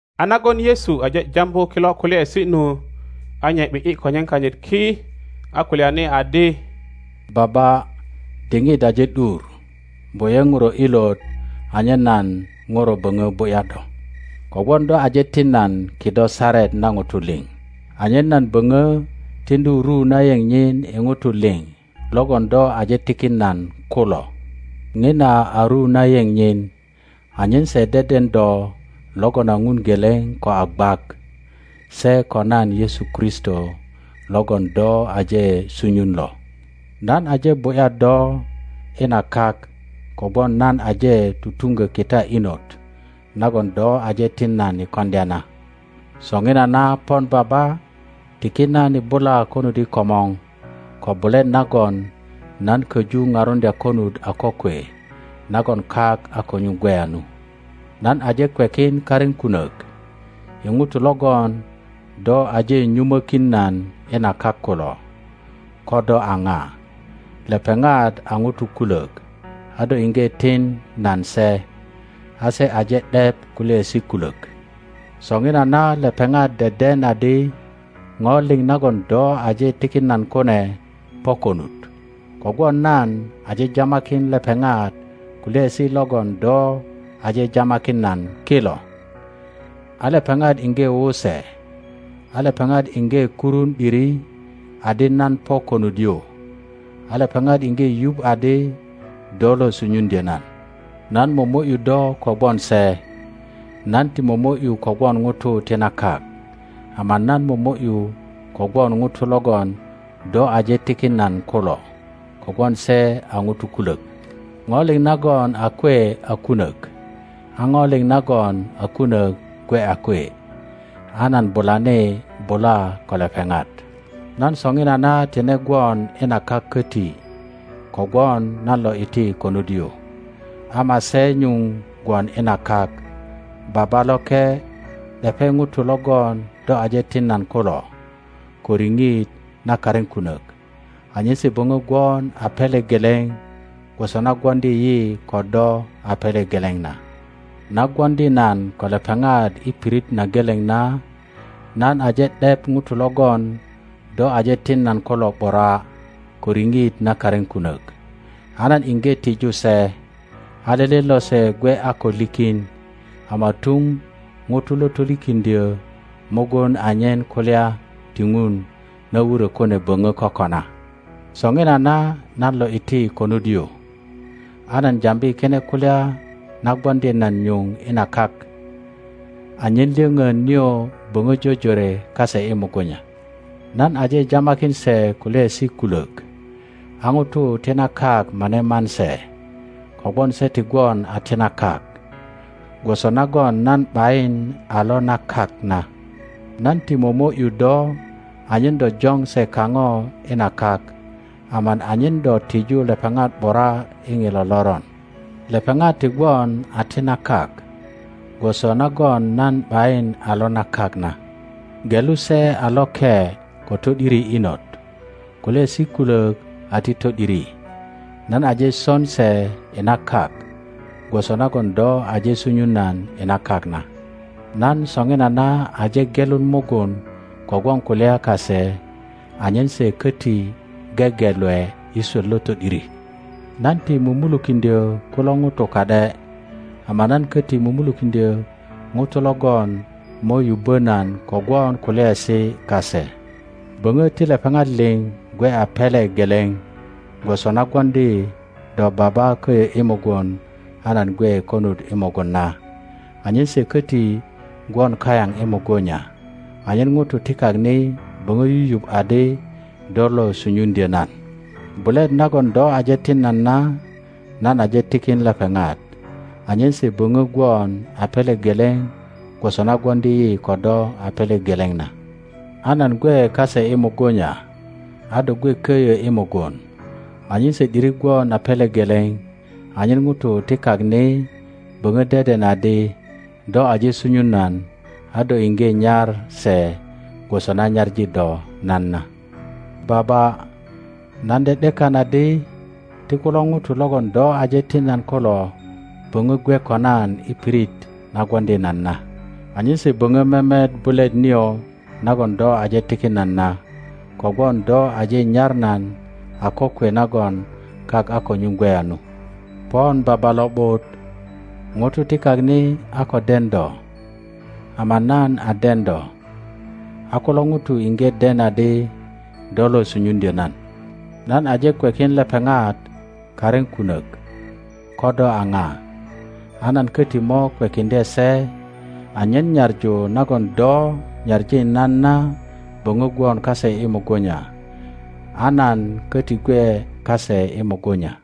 A nagon Yesu aje jambu kilo kulyaesi nu, a nye ’bi ’yi konyen kanyit ki, a kulyani adi, Baba, diŋit aje ’dur; bu ’ye Ŋuro ilot anyen nan Ŋuro böŋö bu ’ya do, kogwon do aje tin nan kido saret na ŋutu liŋ, anyen nan boŋö tiŋdu ru na yeŋ nyin i ŋutu liŋ logon do aje tikin nan kulo. Ŋina a ru na yeŋ nyin anyen se deden do logon a Ŋun geleŋ ko a gwak, se ko nan Yesu Kristo logon do aje sunyun lo. Nan aje bu ’ya do i na kak kogwon nan aje tutuŋgo kita inot nagon do aje tin nan i koŋdya na. Soŋinana pon Baba, tiki nan i bula konut i komor ko bulet nagon nan köju parundya konut a kokwe nagon kak a ko nyuŋ gweya nu. Nan aje kwekin karin kunok i ŋutu logon do aje nyumokin nan i na kak kulo ko do a ŋa. Lepeŋat a ŋutu kulök, a do iŋge tin nan se, a se aje ’dep kulyaesi kulök. Soŋinana lepeŋat deden adi ŋo liŋ nagon do aje tikin nan kune po konut; kogwon nan aje jamakin lepeŋat kulyaesi logon do aje jamakin nan kilo, a lepeŋat iŋge wu se, a lepeŋat iŋge kurun ’diri adi nan po konut yu, a lepeŋat iŋge yuŋ adi do lo sunyuŋdyö nan. Nan momo ’yu do kogwon se. Nan ti momo ’yu kogwon ŋutu ti na kak, ama nan pomo ’yu kogwon ŋutu logon do aje tikin nan kulo, kogwon se a ŋutu kulök. Ŋo liŋ nagon a kwe a kunök, a ŋo liŋ nagon a kunök gwe a kwe, a nan bulani bula ko lepeŋat. Nan soŋinana tine gwon i na kak koti kogwon nan lo iti konut yu, ama se nyuŋ gwon i na kak. Baba loke, ’depe ŋutu logon do aje tin nan kulo ko riŋit na karin kunök, anyen se böŋö gwon a pele geleŋ gwoso na gwoŋdi yi ko do a pele geleŋ na. Na gwoŋdi nan ko lepeŋat i pirit na geleŋ na nan aje ’dep ŋutu logon do aje tin nan kulo ’bura ko riŋit na karin kunök, a nan iŋge tiju se, a lele lose gwe a ko likin, ama tuŋ ŋuto lo tolikiŋdyö mugun, anyen kulya ti Ŋun na wurö kune böŋo kokona. Soŋinana nan lo iti konut yu; a nan jambi kine kulya na gwoŋdi nan nyuŋ i na kak, anyen lyoŋon nio boŋö jojore kase i mugunya. Nan aje jamakin se kulyaesi kulök, a ŋutu ti na kak mane man se, kogwon se ti gwon a ti na kak gwoso nagon nan ’bayin a lo na kak na. Nan ti momo ’yu do anyen do joŋ se kaŋo i na kak, ama anyen do tiju lepeŋat ’bura i ŋilo loron. Lepeŋat ti gwon a ti na kak, gwoso nagon nan ’bayin a lo na kak na. Gelu se a loke ko to ’diri inot. Kulyaesi kulok a ti to ’diri. Nan aje son se i na kak gwoso nagon do aje sunyun nan i na kak na. Nan soŋinana aje gelun mugun kogwon kulya kase anyen se köti gegelwe i swöt lo to ’diri. Nan ti mumulukiŋdyö kulo ŋutu ka ’de, ama nan koti mumulukiŋdyö ŋutu logon mo yubbo nan kogwon kulyaesi kase. Boŋo ti lepeŋat liŋ gwe a pele geleŋ gwoso na gwoŋdi do Baba köyo i mugun a nan gwe konut i mugun na, anyen se koti gwon kayaŋ i mugunya, anyen ŋutu ti Lak ni boŋo yuyuŋ adi do lo sunyuŋdyö nan. Bulet nagon do aje tin nan na nan aje tikin lepeŋat, anyen se böŋo gwon a pele geleŋ gwoso na gwoŋdi yi ko do a pele geleŋ na; a nan gwe kase i mugunya, a do gwe köyö i mugun, anyen se ’diri gwon a pele geleŋ, anyen ŋutu ti kak ni boŋo deden adi do aje sunyun nan, a do iŋge nyar se gwoso na nyaŋi do nan na. Baba, nan ’de ’dekan adi ti kulo ŋutu logon do aje tin nan kulo boŋö gwe ko nan i pirit na gwoŋdi nan na, anyen se boŋö memet bulet nio nagon do aje tikin nan na, kogwon do aje nyar nan a kokwe nagon kak a ko nyuŋ gweya nu. Pon Baba lo ’but, ŋutu ti kak ni a ko den do, ama nan a den do, a kulo ŋutu iŋge den adi do lo sunyun-dyo nan. Nan aje kwekin lepeŋat karin kunök ko do a ŋa, a nan köti mo kwekiŋdye se, anyen nyaŋu nagon do nyaŋi nan na böŋö gwon kase i mugunya, a nan koti gwe kase i mugunya.